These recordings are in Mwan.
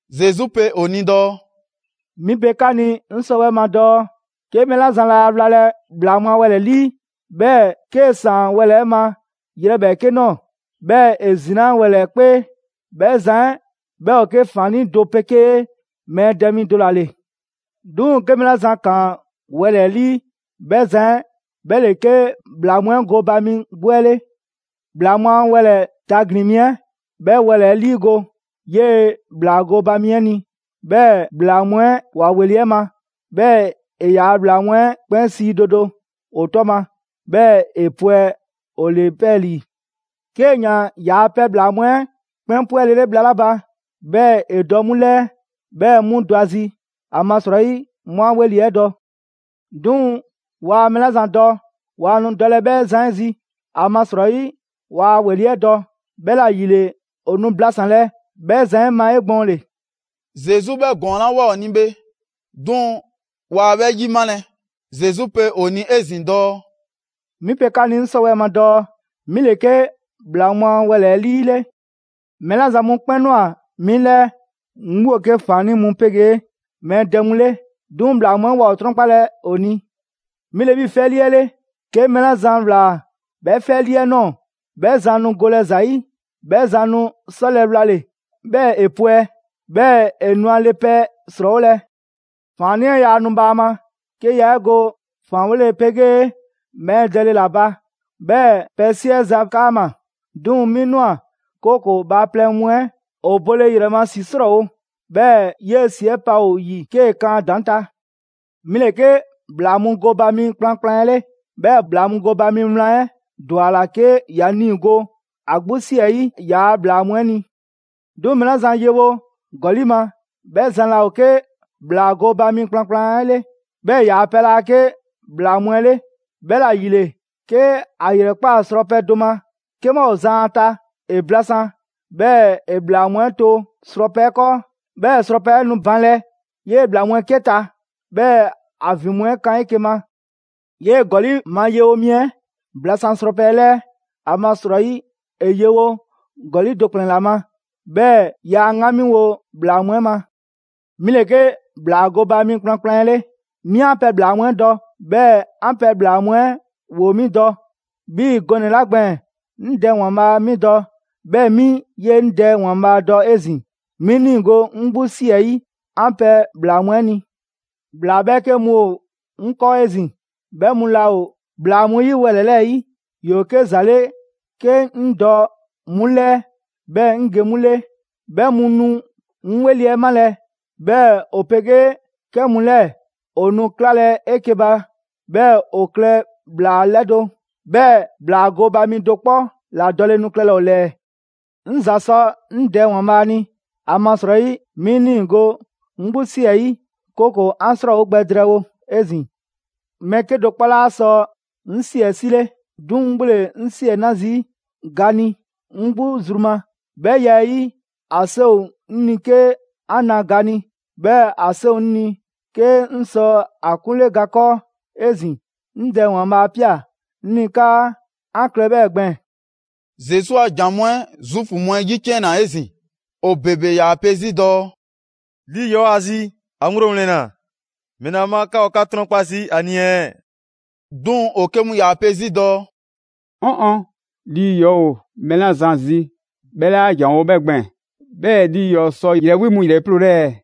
Zesu pe ‑o ni dɔɔ: «'Mi pe 'ka ni 'sɔwɛɛ‑ ma dɔɔ 'ke mɛɛ 'la zan laa wlalɛ ‑bhlaa mu a wɛlɛ‑ 'ɛ 'lii, 'bhɛɛ‑ 'kee‑ ‑saan wɛlɛ‑ 'ɛ ma yrɛ ‑bhɛɛke' ꞊nɔɔ, 'bhɛɛ‑ ‑e ‑zinaa' wɛlɛ‑ 'ɛ 'kpee, 'bhɛ zan 'ɛ 'bhɛ ‑o 'ke ‑faannii' do 'pegee mɛɛ dɛ mi do ‑la ‑le. 'Duŋ‑ 'ke mɛɛ 'la zan ‑kaan wɛlɛ‑ 'ɛ 'lii, 'bhɛ zan 'ɛ 'bhɛ ‑le 'ke ‑bhlaa mu 'ɛ gooba mi 'gbu 'ɛ 'le. ‑Bhlaa mu a wɛlɛ‑ tagbin‑ mi 'ɛ, 'bhɛ wɛlɛ‑ 'ɛ 'liigo‑ 'yee‑ ‑bhlaa gooba mi 'ɛ ni. 'Bhɛɛ‑ ‑bhlaa mu 'ɛ ‑wa ‑weli' 'ɛ ma; 'bhɛɛ‑ ‑e ‑yaa' ‑bhlaa mu 'ɛ 'kpɛn sii do do ‑o 'tɔ ma, 'bhɛɛ ‑e pwɛ ‑o ‑le 'pɛɛlii‑. 'Kee‑ ‑yaan ‑yaa' pɛ ‑bhlaa mu 'ɛ 'kpɛn 'pwɛlele bhla 'la ba, 'bhɛɛ‑ ‑e dɔ 'mu ‑lɛɛ, 'bhɛɛ 'mu dɔ ‑a zi ‑amasrɔyi 'mu 'a 'weli‑ 'ɛ dɔ. 'Duŋ‑ waa mɛɛ 'la zan dɔ, waa nu dɔlɛ 'bhɛ zan 'ɛ zi, ‑amasrɔyi waa a ‑weli' 'ɛ dɔ; 'bhɛla‑ ‑yile ‑o nu blasanlɛ 'bhɛ zan 'ɛ ma 'egbɔɔnle.» Zesu 'bhɛ ‑gɔɔn 'la ꞊woa ‑o ni bhe, 'duŋ‑ waa 'bhɛ 'yimalɛ. Zesu pe ‑o ni 'ezin‑ dɔɔ: «'Mi pe 'ka ni 'ŋ 'sɔwɛɛ‑ ma dɔɔ 'mi ‑le 'ke ‑bhlaa mu a wɛlɛ‑ 'ɛ 'lii 'le. Mɛɛ 'la zan mu 'kpɛn ꞊nwa 'mi 'lɛɛ, 'mu ‑o 'ke ‑faannii' mu 'pegee mɛɛ dɛ mu 'le; 'duŋ‑ ‑bhlaa mu 'ɛ waa ‑o 'trɔnkpalɛ ‑o ni. 'Mi ‑le 'bhii‑ 'fɛlii 'ɛ 'le, 'ke mɛɛ 'la zan ‑wlaa 'bhɛ 'fɛlii 'ɛ ꞊nɔɔ, 'bhɛ zan nu golɛ ‑za 'yi. 'Bhɛ zan nu 'sɔlɛ‑ wlale, 'bhɛɛ‑ ‑e pwɛ, 'bhɛɛ‑ ‑e nu ‑a le pɛ ‑srɔɔwolɛ. ‑Faannii' 'ɛ yaa nu bhaama, 'ke yaa 'e go ‑faanwole 'pegee mɛɛ dɛle ‑la ba, 'bhɛɛ‑ pɛ 'siɛza‑ 'kaama‑. 'Duŋ‑ 'mi ꞊nwa, 'kooko‑ bhaaplɛŋ mu 'ɛ ‑o bole ‑yrɛ ma ‑si 'srɔɔwo‑, 'bhɛɛ‑ 'yee‑ ‑si 'ɛ pa ‑o ‑yi 'kee‑ kan a ‑daŋ' ta. 'Mi ‑le 'ke ‑bhlaa mu gooba mi kplankplan 'ɛ 'le. 'Bhɛɛ‑ ‑bhlaa mu gooba mi wlan 'ɛ ‑dwa a ‑la 'ke ‑ya niigo ‑a 'gbu 'si 'ɛ 'yi ‑yaa' ‑bhlaa mu 'ɛ ni. 'Duŋ‑ mɛɛ 'la zan yewo ‑gɔli' ma, 'bhɛ zan 'laa ‑o 'ke ‑bhlaa gooba mi kplankplan 'ɛ 'le. 'Bhɛɛ‑ ‑yaa' pɛ 'laa 'ke ‑bhlaa mu 'ɛ 'le, 'bhɛla‑ ‑yile 'ke ‑a ‑yrɛkpaa srɔpɛ do ma 'ke 'bhɛ ‑o zan ‑a ta, ‑e blasan, 'bhɛɛ‑ ‑e ‑bhlaa mu 'ɛ to srɔpɛ 'ɛ 'kɔɔ. 'Bhɛɛ‑ srɔpɛ 'ɛ nu banlɛ 'yee‑ ‑bhlaa mu 'ɛ 'ke ta, 'bhɛɛ‑ ‑a ‑vin mu 'ɛ kan 'eke‑ ma. 'Yee‑ ‑gɔli' ma yewo mi 'ɛ blasan srɔpɛ 'ɛ 'lɛɛ, ‑amasrɔyi ‑e yewo ‑gɔli' do ‑kplɛnnɛ' ‑la ma, 'bhɛɛ‑ yaa a 'ŋgamiwo ‑bhlaa mu 'ɛ ma. 'Mi ‑le 'ke ‑bhlaa gooba mi kplankplan 'ɛ 'le. 'Mi 'an pɛ ‑bhlaa mu 'ɛ dɔ, 'bhɛɛ‑ 'an pɛ ‑bhlaa mu 'ɛ ‑woo 'mi dɔ. 'Bhii‑ gɔnɛ‑ 'la gbɛɛn‑, 'ŋ Dɛ ‑Waanbhaa' 'mi dɔ, 'bhɛɛ‑ 'mi 'yee‑ 'ŋ Dɛ ‑Waanbhaa' dɔ 'ezin‑. 'Mi 'ŋ 'niigo‑ 'ŋ 'gbu 'si 'ɛ 'yi 'an pɛ ‑bhlaa mu 'ɛ ni. ‑Bhlaa 'bhɛɛke mu ‑o 'ŋ 'kɔɔ 'ezin‑, 'bhɛ mu laa ‑o ‑bhlaa mu yi wɛlɛ‑ 'lɛɛ‑ 'yi. ‑Yoo 'ke ‑za 'le 'ke 'ŋ dɔ 'mu 'lɛɛ 'bhɛɛ‑ 'ŋ ge 'mu 'le. 'Bhɛ mu nu 'ŋ 'weli‑ 'ɛ malɛ, 'bhɛɛ‑ ‑o 'pegee 'kɛ mu 'lɛɛ‑ ‑o nu 'klalɛ‑ 'eke‑ ba, 'bhɛɛ‑ ‑o klɛ ‑bhlaa 'lɛdo‑, 'bhɛɛ‑ ‑bhlaa gooba mi do 'kpɔ ‑la dɔle nu klɛlɛ ‑o ‑lɛɛ.» «'Ŋ ‑za sɔ 'ŋ Dɛ ‑Waanbhaa' ni, ‑amasrɔyi 'mi 'ŋ 'niigo‑ 'ŋ 'gbu 'si 'ɛ 'yi, 'kooko‑ 'an 'srɔɔwo gbɛ drɛɛwo 'ezin‑. Mɛɛ 'kedo‑ 'kpɔ 'laa sɔ 'ŋ ‑si 'ɛ 'sile, 'duŋ‑ 'ŋ 'gbu ‑le 'ŋ si 'ɛ 'na zii' ga ni 'ŋ 'gbu zru ma. 'Bhɛ ya 'ɛ 'yi, ‑a 'seŋ ‑o 'ŋ ni 'ke 'an na ga ni, 'bhɛɛ‑ ‑a 'seŋ ‑o 'ŋ ni 'ke 'ŋ sɔ a 'kunle ga 'kɔɔ 'ezin‑. 'Ŋ Dɛ ‑Waanbhaa 'a ꞊pia 'ŋ ni 'kaa 'an klɛ 'bhɛɛ‑ gbɛɛn‑.» Zesu a ‑jan mu 'ɛ Zuufu mu 'ɛ 'yiciɛnna 'ezin‑. ‑O ‑bebe ‑yaa pe 'zi dɔɔ: «Lii ‑yɔɔ' ‑o ‑a zi! ‑A ŋgblo ‑wlɛnna! ‑Mɛla ma 'ka ‑o 'ka 'trɔnkpa zii' ‑a ni ɛɛ?» 'Duŋ‑ ‑o 'ke mu ‑yaa pe 'zi dɔɔ: «'Ɔn ɔn! Lii ‑yɔɔ' ‑o mɛɛ 'la zan zi 'bhɛ 'laa ‑janwo' 'bhɛ gbɛɛn‑. 'Bhɛɛ‑ lii ‑yɔɔ' sɔ ‑yrɛ 'wi mu ‑yrɛ ‑liiploole ɛɛ?»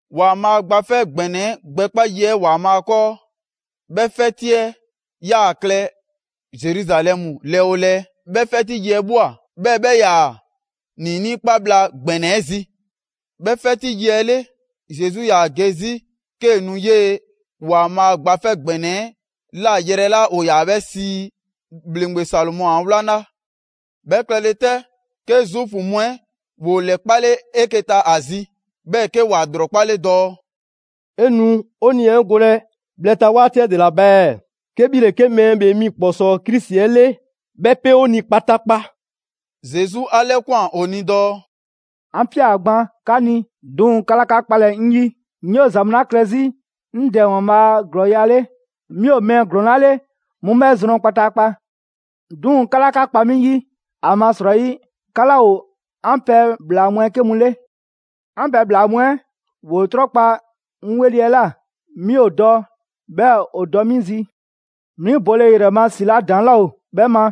‑Waanbhaa' Gba 'Fɛ ‑Gbɛnɛ 'ɛ gbɛkpa yi 'ɛ ‑Waanbhaa' 'kɔɔ, 'bhɛ 'fɛti 'ɛ 'yaa‑ klɛ Zeruzalɛmu lɛɛ 'oo lɛɛ. 'Bhɛ 'fɛti yi 'ɛ ꞊bhwa, 'bhɛɛ‑ 'bhɛ 'yaa‑ ‑niinii' 'kpa bhla ‑gbɛnɛ 'ɛ zi. 'Bhɛ 'fɛti yi 'ɛ 'le, Zesu 'yaa‑ ge 'zi 'kee‑ nu 'yee‑ ‑Waanbhaa' Gba 'Fɛ ‑Gbɛnɛ 'ɛ ꞊la yrɛ 'la ‑o ‑yaa 'bhɛ sii: ‹‑Bhleŋgbe Salomɔ a 'wlaŋla›. 'Bhɛ klɛle 'tɛ, 'ke Zuufu mu 'ɛ ‑woo ‑lɛkpale 'eke‑ ta ‑a zi, 'bhɛɛ‑ 'ke ‑wa ‑lrɔkpale dɔɔ: «'E nu 'o 'nii‑ 'ɛ golɛ bhlɛ ta 'waati 'ɛ ‑dela ba ɛɛ? 'Ke 'bhi ‑le 'ke Mɛɛ ‑Bhee Mi ‑Kpɔsɔɔ Krisi 'ɛ 'le, 'bhɛ 'pe 'o ni kpataakpa.» Zesu 'a 'lɛkwan‑ ‑o ni dɔɔ: «'An 'pia‑ gban 'ka ni, 'duŋ‑ 'ka 'laa 'ka 'kpalɛ‑ 'ŋ 'yi. 'Ŋ 'yoo‑ ‑za mu 'la klɛ 'zi 'ŋ Dɛ ‑Waanbhaa' a ‑glɔɔya' 'le, 'mi ‑o mɛɛ ‑glɔɔn 'la 'le 'mu 'bhɛ zrɔn kpataakpa. 'Duŋ‑ 'ka 'laa 'ka kpa 'mi 'yi, ‑amasrɔyi 'ka 'laa ‑o 'an pɛ ‑bhlaa mu 'ɛ 'ke mu 'le. 'An pɛ ‑bhlaa mu 'ɛ ‑woo 'trɔnkpa‑ 'ŋ 'weli‑ 'ɛ ꞊la. 'Mi ‑o dɔ 'bhɛɛ‑ ‑o dɔ 'mi zi. 'Mi bole ‑yrɛ ma ‑si 'la ‑daŋ' laa ‑o 'bhɛ ma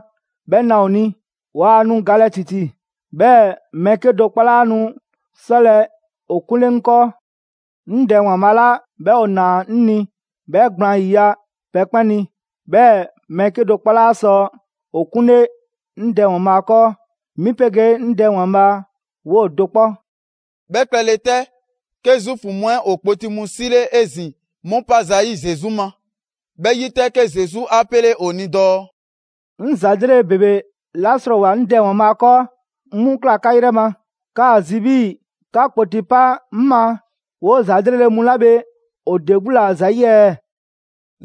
'bhɛ na ‑o ni. Waa nu galɛ ‑titi, 'bhɛɛ‑ mɛɛ 'kedo‑ 'kpɔ 'laa nu 'sɔlɛ‑ ‑o 'kunle 'ŋ 'kɔɔ. 'Ŋ Dɛ ‑Waanbhaa' 'la 'bhɛ ‑o ‑naa 'ŋ ni 'bhɛ gblaan 'yiya‑ pɛ 'kpɛn ni; 'bhɛɛ‑ mɛɛ 'kedo‑ 'kpɔ 'laa sɔ ‑o 'kunle 'ŋ Dɛ ‑Waanbhaa' 'kɔɔ. 'Mi 'pegee 'ŋ Dɛ ‑Waanbhaa' 'woo‑ do 'kpɔ.» 'Bhɛ klɛle 'tɛ, 'ke Zuufu mu 'ɛ ‑o kpoti mu 'sile 'ezin‑ 'mu 'pa zayi' Zesu ma. 'Bhɛ 'yi 'tɛ, 'ke Zesu 'a 'pele ‑o ni dɔɔ: «'Ŋ ‑za 'lrele‑ ‑bebe 'la 'srɔɔwoa‑ 'ŋ Dɛ ‑Waanbhaa' 'kɔɔ, 'ŋ 'mu ‑kla 'ka 'yrɛ ma. 'Ka ‑a zi 'bhii‑ 'ka kpoti pa 'ŋ ma 'woo‑ ‑za 'lrele‑ mu 'la bhe ‑o ‑de 'gbu ‑la ‑zayi' ɛɛ?»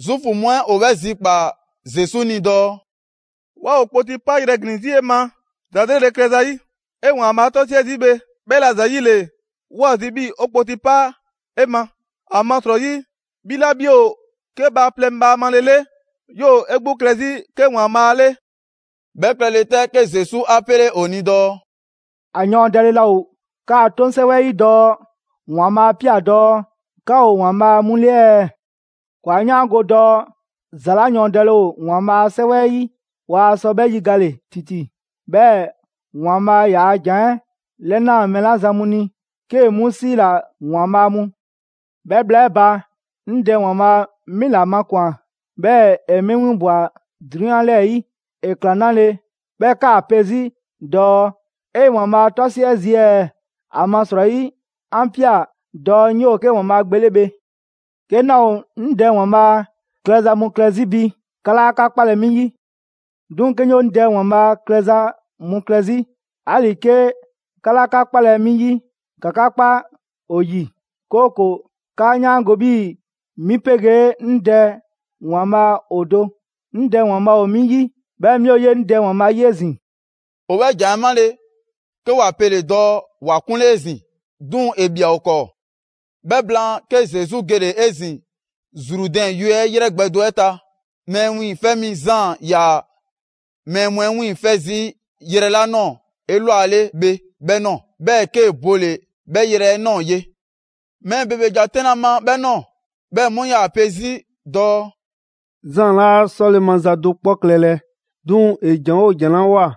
Zuufu mu 'ɛ ‑o 'bhɛ zikpaa‑ Zesu ni dɔɔ: «'Waa ‑o kpoti 'payrɛ‑ ‑glin 'zi 'e ma ‑za 'lrele‑ klɛ ‑zayi'. 'E ‑Waanbhaa' 'tɔsiɛ zii' bhe, 'bhɛla‑ ‑zayile, 'wa zi 'bhii‑ 'o kpoti 'pa 'e ma. ‑Amasrɔyi 'bhi 'la 'bhi ‑o 'ke bhaaplɛŋ bhaamale 'le 'yoo‑ 'e 'gbu klɛ 'zi 'ke ‑Waanbhaa' 'le.» 'Bhɛ klɛle 'tɛ, 'ke Zesu 'a 'pele ‑o ni dɔɔ: «‑A yɔɔndɛle laa ‑o 'kaa 'toŋ 'sɛwɛ 'ɛ 'yi dɔɔ ‑Waanbhaa' 'a 'pia‑ dɔɔ: ‹'Ka ‑o ‑waanbhaa' mu 'le ɛɛ?› ‑Kɔɔ' 'a 'yaango‑ dɔɔ ‑za 'la ‑yɔɔndɛle ‑o ‑Waanbhaa' 'a 'Sɛwɛ 'ɛ 'yi, waa sɔ 'bhɛ 'yigale ‑titi. 'Bhɛɛ‑ ‑Waanbhaa' ‑yaa' ‑jan 'ɛ 'lɛnaa‑ mɛɛ 'la zan mu ni, 'kee‑ 'mu 'siila‑ ‹‑waanbhaa' mu.› 'Bhɛ bhla 'ɛ ba, 'ŋ Dɛ ‑Waanbhaa' 'mi ‑la makwan‑ 'bhɛɛ‑ ‑e 'mi 'winbwa‑ 'drunyan 'lɛɛ‑ 'yi. ‑E ‑kla 'nale‑ 'bhɛɛ‑ 'kaa‑ pe 'zi dɔɔ: ‹'E ‑Waanbhaa' 'tɔsiɛ zii' ɛɛ?› ‑Amasrɔyi 'an ꞊pia dɔɔ 'ŋ 'yoo‑ 'ke ‑Waanbhaa' Gbe 'le bhe. 'Ke 'naa ‑o 'ŋ Dɛ ‑Waanbhaa' klɛza mu klɛ 'zi bi, 'ka 'laa 'ka 'kpalɛ‑ 'mi 'yi. 'Duŋ‑ 'ke 'ŋ 'yoo 'ŋ Dɛ ‑Waanbhaa' klɛza mu klɛ 'zi, 'ali‑ 'ke 'ka 'laa 'ka 'kpalɛ‑ 'mi 'yi, ‑ka 'ka 'kpa ‑o ‑yi, 'kooko‑ 'kaa 'yaango‑ 'bhii‑ 'mi 'pegee 'ŋ Dɛ ‑Waanbhaa ‑o do: 'Ŋ ‑Dɛ ‑Waanbhaa' ‑o 'mi 'yi, 'bhɛɛ‑ 'mi ‑o 'yee‑ 'ŋ Dɛ ‑Waanbhaa' 'yi 'ezin‑.» ‑O 'bhɛ ‑jan 'ɛ 'male‑, 'ke ‑wa pele‑ dɔɔ ‑wa 'kunle 'ezin‑. 'Duŋ‑ ‑e ꞊bhia ‑o 'kɔɔ. 'Bhɛ blaan, 'ke Zesu gele‑ 'ezin‑ Zrudɛn yue 'ɛ ‑yrɛ gbɛ do 'ɛ ta, Mɛɛ Wiiŋfɛ' Mi Zaan ‑yaa mɛɛ mu 'ɛ 'wiiŋfɛ zii' 'yrɛ 'la ꞊nɔɔ 'elwale bhe 'bhɛ ꞊nɔɔ. 'Bhɛɛ‑ 'kee‑ bole‑ 'bhɛ yrɛ 'ɛ ꞊nɔɔ ye. Mɛɛ ‑bebe ‑ja 'tɛnlɛ‑ ‑a ma 'bhɛ ꞊nɔɔ. 'Bhɛɛ‑ 'mu 'yaa‑ pe 'zi dɔɔ: «Zaan 'laa 'sɔle‑ maza do 'kpɔ klɛlɛ, 'duŋ‑ ‑e ‑jan 'oo ‑jan 'la ꞊woa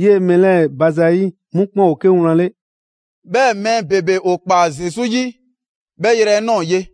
'yee‑ mɛɛ 'lɛɛ‑ ba zayi', 'mu 'kpɛn ‑o 'ke wlan 'le.» 'Bhɛɛ‑ mɛɛ ‑bebe ‑o ‑kpaa Zesu 'yi 'bhɛ yrɛ 'ɛ ꞊nɔɔ ye.